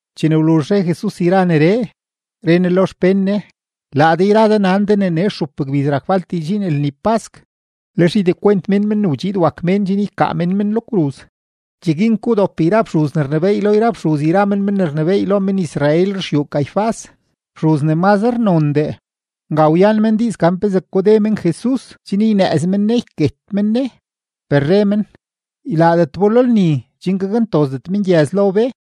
Chene wluzh re Jesus yra neree, re Ne lo xpén Ne: ―Laa de yra de nan de ne nee stxup gbiz rak falt ne ydxiin lni pask, lex ydekwent mén Men ne wdxiid wak Mén chen ykaa mén men lo kruz. Cheguin ke wdop yra fxuz ne rnebééy lo yra fxuz yra men men ne rnebééy lo men-Israel ruxyuu Caifás, fxuz ne mazre nondee. Nga wyan men diiz gan pezee kode men Jesus chen ynëëz men Ne yket men Ne. Per re men: ―Ylaadet bo lo lni chen gakntozdet mengyëz lo be.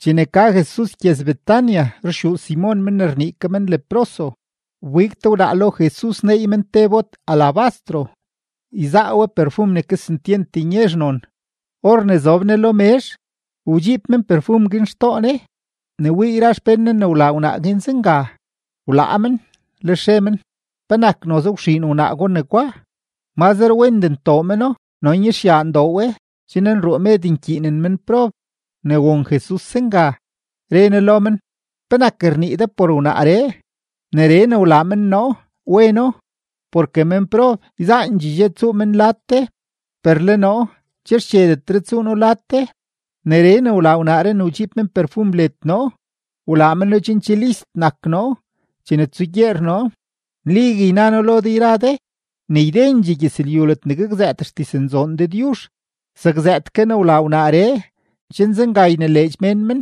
Chene ka Jesus gyëz-Betania ruxyuu Simon men ne rnii ke men Leproso, wbig te wnaa lo Jesus neey men te bot alabastro, yzaa we perfum ne kesentyent nyezh non. Or ne zob Ne lo mezh, wdxiib men perfum guin xtoo Ne. Ne wii yra xpén Ne ne wlaa wnaa guin zenga, wlaa men, lex re men: ―¿Penak noze wxiin wnaa gwa negwa? Mazre wendee ntoo meno no nyezhyaa ndoo we chen nruu med nkyiinen menprob. Ne won Jesus zenga, re Ne lo men: ―¿Penak rnii de por wnaaree? Neree ne wlaa men noo, weno. Porke menprob yzaandxee dxe tsuu men lad de, per le noo che xchedetre tsuu noo lad de. Neree ne wlaa wnaaree ne wdxiib men perfum led noo, wlaa meno chen che list nak noo chene tsugyeer noo. Nligue yna noo lo de yra de ne ydendxee gyëzlyu ledne gakzëëttee xdiznzoon Dëdyuzh, zakzëët ke ne wlaa wnaaree, chen zenga ynileedx mén men.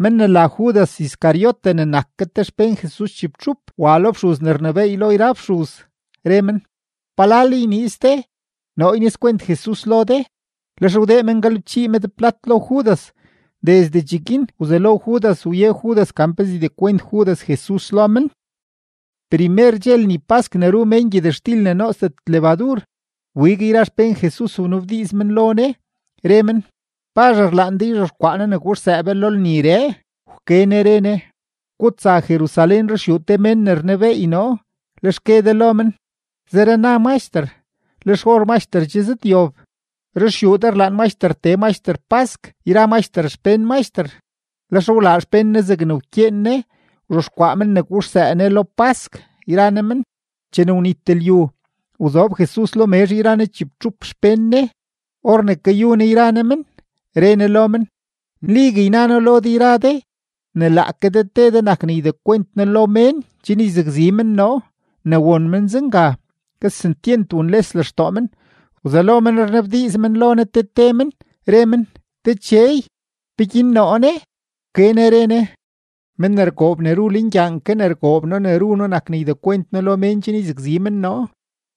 Men ne la Judas Iscariote ne nak ke xpén Jesus chibtxup wa lo fxuz ne rnebééy lo yra fxuz, re men: ―¿Palal yniiz de noo ynizkwent Jesus lo de? Lex wdee men galebchii med plat lo Judas. Desde cheguin wzelo Judas wye Judas gan pezee ydekwent Judas Jesus lo men. Primer dxe lni pask ne ru mén gyëtxtil ne nootsdet lebadur, wbig yra xpén Jesus wnabdiiz men lo Ne, re men: ―¿Pazh rlaan de yzhexkwaa noo ne guxsëë be lo lniree? Wke Ne re Ne: ―Gutsa Jerusalén ruxyuu te mén ne rnebeey noo, lex gue de lo men: “Zere na Maxter: Le xor Maxter che zëdyob. Ruxyuu de rlaan Maxter tee Maxter pask yra Maxter xpén Maxter.” Lex wlaa xpén Ne zegne wkyeen Ne, wzhexkwaa men ne guxsëë Ne lo pask yra Ne men. Chene wnit lyu, wzob Jesus lo mezh yra Ne chibtxup xpén Ne; or ne kayu Ne yra Ne men, re Ne lo men: ―Nligue yna noo lo de yra de, ne laake de te de nak ne ydekwent noo lo mén chen yzakzi men noo. Ne won men zenga, kesentyent wunles lextoo men, wzelo men rnabdiiz men lo Ne te te men, re men: ―Dechey, ¿peguin noo ne? Wke Ne re Ne: ―Men ne rgoob ne ru lengyaan ke ne rgoob noo ne ru noo nak ne ydekwent noo lo mén chen yzakzi men noo.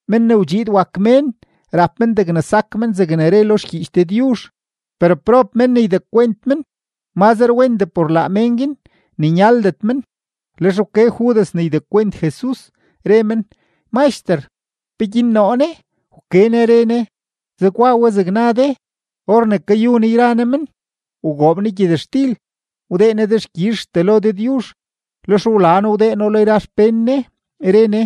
Men ne wdxiid wak Mén rap men degne sak men zegne re lo xgyiich Dëdyuzh; per ¡prob mén ne ydekwent men! Mazre wendee por laa mén guin ne nyaldet men. Lex wke Judas ne ydekwent Jesus, re men: ―Maxter, ¿peguin noo ne? Wke Ne re Ne: ―Zegwa we zeg na de. Or ne kayu Ne yra Ne men, wgoob Ne gyëtxtil, wdee Ne dexkyizhtee lo Dëdyuzh, lex wla No wdee No lo yra xpén Ne, re Ne: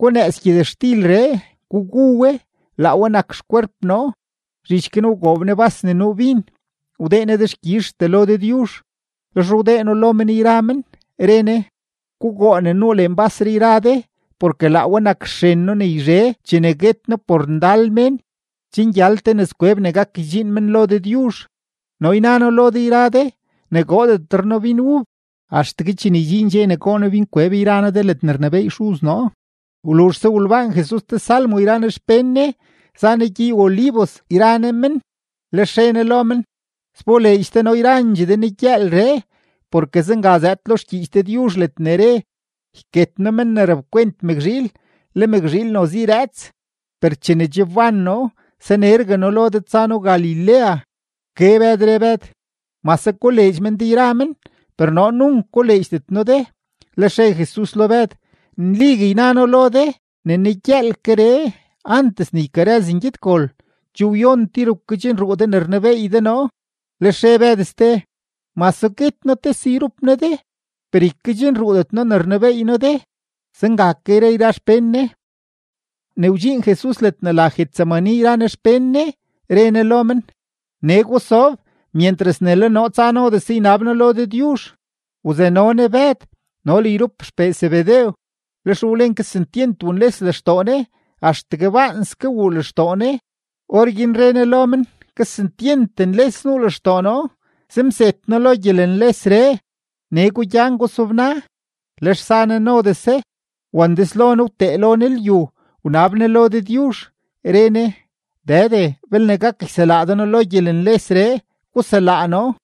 ―Gunëëz gyëtxtilree, gugu we; laa we nak xkwerp noo. Zhich guin wgoob Ne bas ne nuu bin, wdee Ne dexkyizhtee lo Dëdyuzh, lex wdee No lo men yra men, re Ne: ―Gugoo ne nuu lenbasree yra de, porke laa we nak xren noo ne yzhe chene guet noo por ndal mén, chen gyal te nëzkweb ne gak ydxiin men lo Dëdyuzh. No yna noo lo de yra de ne goodetre noo bin ub, axtegue chene ydxiin dxe ne goo noo binkweb yra noo de ledne rnebééy Xuz noo. Wluzhse wolbaan Jesus te salmo yra Ne xpén Ne, za Ne gyey-Olivos yra Ne men. Lex re Ne lo men: ―Sboleedx de noo yrandxee de negyëëlree, porke zenga zëëd lo xgyiich Dëdyuzh ledne re: “Yket noo men ne rapkwent mëkzhiil, le mëkzhiil noze yrëëts.” Per chene che wban noo, sanergue noo lo de tsa noo Galilea. Wke Bëd, re Bëd: ―Mase koleedx men de yra men, per noo nunk koleedxdet noo de. Lex re Jesus lo Bëd: ―Nligue yna noo lo de ne negyëëlkeree, antes ne ykarëz ngyedgol, che wyon tir wkedxnruu de ne rnebeey de noo. Lex re Bëd ste: ―Mase guet noo tese yrup noo de, per ykedxnruudet noo ne rnebeey noo de. Zenga ke re yra xpén Ne. Ne wdxiin Jesus ledne la Getsemaní yra Ne xpén Ne, re Ne lo men: ―Nee gusob myentras ne le noo tsa nodese ynab noo lo Dëdyuzh. Wzano Ne Bëd no le yrup xpee Zebedew, lex wlen kesentyent wunles lextoo Ne, axtegue baanske wuu lextoo Ne. Orguin re Ne lo men: ―Kesentyent nles nuu lextoo noo, zem zet noo lo gyelenlesree. Nee gugyan, gusobna. Lex za Ne nodese, wandeslo Ne wtee lo Ne lyu wnab Ne lo Dëdyuzh, re Ne: ―Dëde, belne gak yselaa de noo lo gyelenlesree, guselaa noo;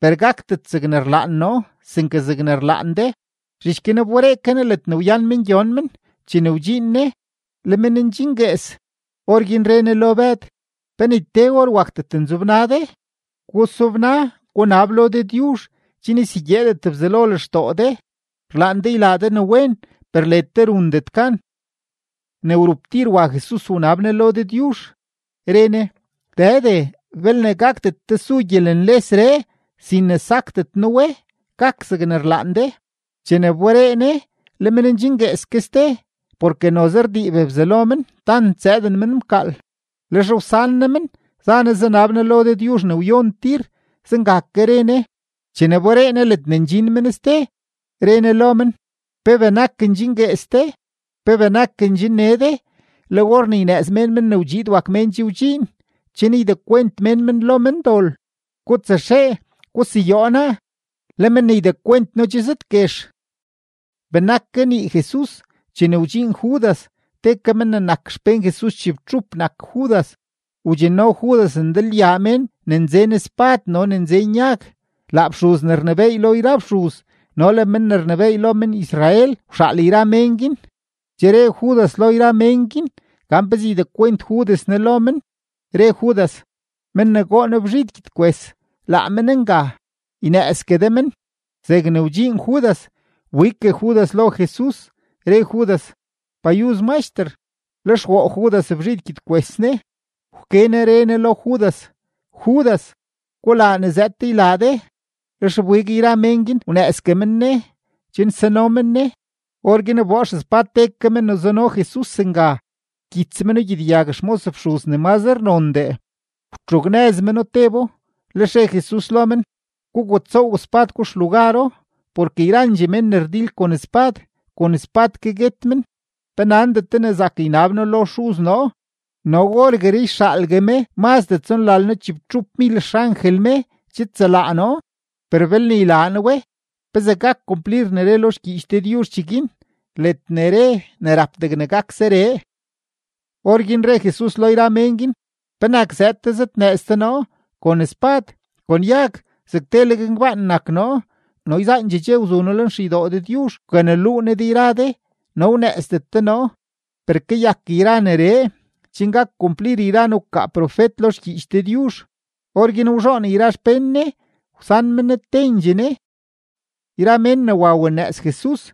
per gakdet zegne rlaan noo, sinke zegne rlaan de. Zhich guin wberee ke Ne ledne wyan men gyon men; chene wdxiin Ne, le men ndxinguees. Orguin re Ne lo Bëd: ―¿Pe ni te or wakdet nzobna de? Gusobna, gunab lo Dëdyuzh chen ysegyeedet Bzelo lextoo de. Rlaan de ylaa de ne wen, per led de rundet gan. Ne wrup tir wa Jesus wnab Ne lo Dëdyuzh, re Ne: ―Dëde, belne gakdet tesu gyelenlesree sin ne sakdet noo we, gak zegne rlaan de. Chene wberee Ne, le men ndxinguees ke ste, porke noze rdiib bzalo men tant zëëden men mkaal. Lex wsan Ne men za Ne zanab Ne lo Dëdyuzh ne wyon tir, zenga ke re Ne. Chene wberee Ne ledne ndxin men ste, re Ne lo men: ―¿Pe benak ndxinguees de? ¿Pe benak ndxinne de? Le or ne ynëëz mén Men ne wdxiid wak Mén che wdxiin, chen ydekwent mén men lo mendol. Gutsaxee, guseyoo naa; le men ne ydekwent noo che zëdguex. Benak kanii Jesus chene wdxiin Judas; te ke men ne nak xpén Jesus chibtxup nak Judas; wdxinno Judas ndalyaa mén ne nzen spad no mén ne nzen yag. Laa fxuz ne rnebééy lo yra fxuz no le men ne rnebééy lo men-Israel wxaal yra mén guin. Che re Judas lo yra mén guin gan pezee ydekwent Judas Ne lo men, re Judas: ―Men ne goo noo bzhid gyedkwes, laa men nga; ynëëzgue de men. Zegne wdxiin Judas, wbiggue Judas lo Jesus, re Judas: ―¡Payuz, Maxter! Lex woo Judas bzhid gyedkwes Ne. Wke Ne re Ne lo Judas: ―Judas, gulaa ne zëëd de ylaa de. Lex wbig yra mén guin wnëëzgue men Ne chen sano men Ne. Orguin wboo xespad te ke men ne zuno Jesus nga, wkyits meno gyedyag xmos fxuz ne mazre nondee, wtxugnëz meno tebo. Lex re Jesus lo men: ―Gugutsoow spad gwa xlugaro. Porke yrandxee men ne rdil kon spad, kon spad ke guet men. ¿Pe nandet de ne zak ynab noo lo Xuz noo no orgueree yxaalgue me mazdee tsonlalno-chibtxupmil xangel me chidselaa noo? Per belne ylaa noo we, ¿pezee gak kumplir ne re lo xgyiich Dëdyuzh cheguin, ledne re ne rap degne gak zeree? Orguin re Jesus lo yra mén guin: ―¿Penak zëëd de zëdnëëz de noo kon spad, kon yag, zeg teleg ngbaan nak noo? No yzaandxee dxe wzu noo lenxeydoo Dëdyuzh wkaneluu noo de yra de, no wnëëzdet de noo. Per kayak yra neree chen gak kumplir yra ne wkaa profet lo xgyiich Dëdyuzh. Orguin wzhoon yra xpén Ne, wsan men Ne tendxee Ne. Yra mén ne wa wanëëz Jesus,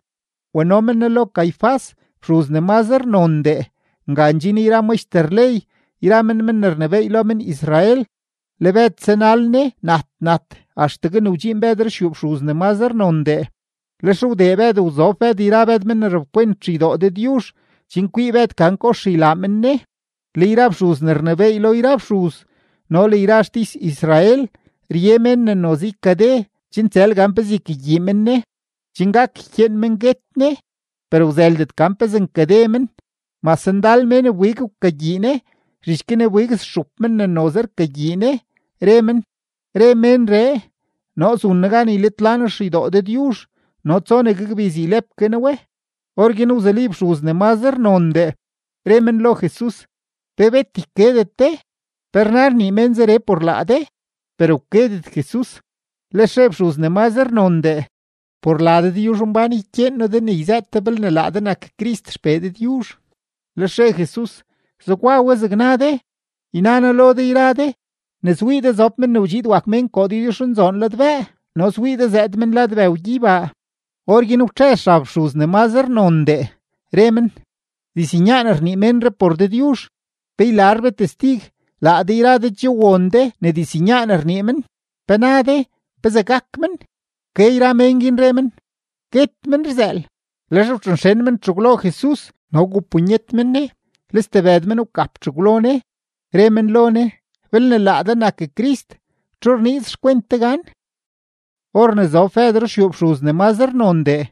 wano men Ne lo Caifás, fxuz ne mazre nondee. Nga ndxin yra maxter ley yra men men ne rnebééy lo men-Israel. Le Bëd zanal Ne nat nat axtegue ne wdxiin Bëd ruxyuu fxuz ne mazre nondee. Lex wdee Bëd wzob Bëd yra Bëd men ne rapkwent xeydoo Dëdyuzh, chen kwii Bëd gan kox ylaa men Ne. Le yra fxuz ne rnebééy lo yra fxuz no le yra xtis-Israel rye mén ne noze ykade chen tsël gan pezee ykagyii men Ne, chen gak ykyeen men guet Ne. Per wzëldet gan pezee nkade men, mase ndal mén wbig wkagyii Ne. Zhich guin wbig stxup men ne noze rkagyii Ne, re men: ―Re ménree: “Noo zun noo gan ylitla noo xeydoo Dëdyuzh no tsonegue gbiz ylep ke noo we.” Orguin wzuli fxuz ne mazre nondee, re men lo Jesus: ―¿Pe bet ykedet de? ¿Pe rna rnii men zeree por laa de? Per wkedet Jesus. Lex re fxuz ne mazre nondee: ―Por la Dëdyuzhmbán ykyeen noo de ne yzëët de belne laa de nak Crist XPee Dëdyuzh. Lex re Jesus: ―Zegwa we zeg na de, yna noo lo de yra de, ne swii de zob Men ne wdxiid wak Mén koo Dëdyuzhnzoon ladbëë no swii de zëëd men lad bëw gyeybaa. Orguin wtxëz xab fxuz ne mazre nondee, re men: ―Diznyaan rnii ménree por Dëdyuzh; pe ylar be testig. Laa de yra de che won de ne diznyaan rnii men. ¿Pe na de, pezee gak men? Wke yra mén guin, re men: ―Guet men rzëël. Lex wtxonxen men txegwlo Jesus no wgupunyet men Ne; le stebëd men wgap txegwlo Ne, re men lo Ne: ―Belne laa de nak Crist, ¿txu rniiz xkwent de gan? Or ne zob Bëd ruxyuu fxuz ne mazre nondee,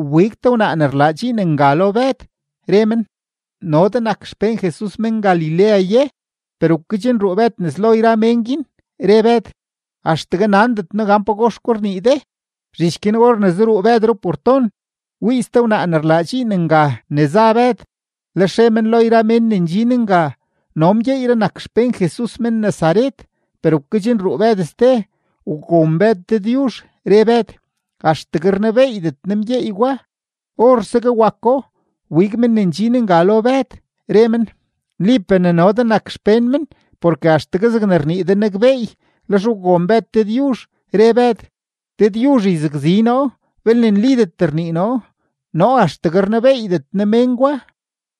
wbig te wnaa ne rlaa dxiin nga lo Bëd, re men: ―¿No de nak xpén Jesus men-Galilea ye? Per wkedxnruu Bëd nes lo yra mén guin, re Bëd: ―Axtegue nandet noo gan pagox gwa rnii de. Zhich guin or ne zaruu Bëd ruporton, wii ste wnaa ne rlaa dxiin nga ne za Bëd; lex re men lo yra mén ne ndxin nga: ―No mgyeeyree nak xpén Jesus men-Nazaret. Per wkedxnruu Bëd ste, wgon Bëd Dëdyuzh, re Bëd: ―¡Axtegue rnebeeydet noo mgyeey gwa! Orsegue wako, wbig men ne ndxin nga lo Bëd, re men: ―Nlipee ne no de nak te xpén men, porke axtegue zegne rnii de nakbeey. Lex wgon Bëd Dëdyuzh, re Bëd: ―Dëdyuzh yzakzi noo belne nlidet rnii noo. ¡Noo axtegue rnebeeydet noo mén gwa!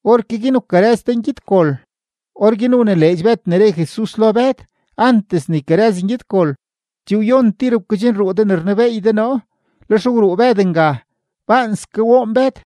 Orke guin wkarëz te ngyedgol. Orguin wnileedx Bëd ne re Jesus lo Bëd: “Antes ne ykarëz ngyedgol, che wyon tir wkedxnruu de ne rnebeey de noo.” Lex wruu Bëd nga; baanske woon Bëd.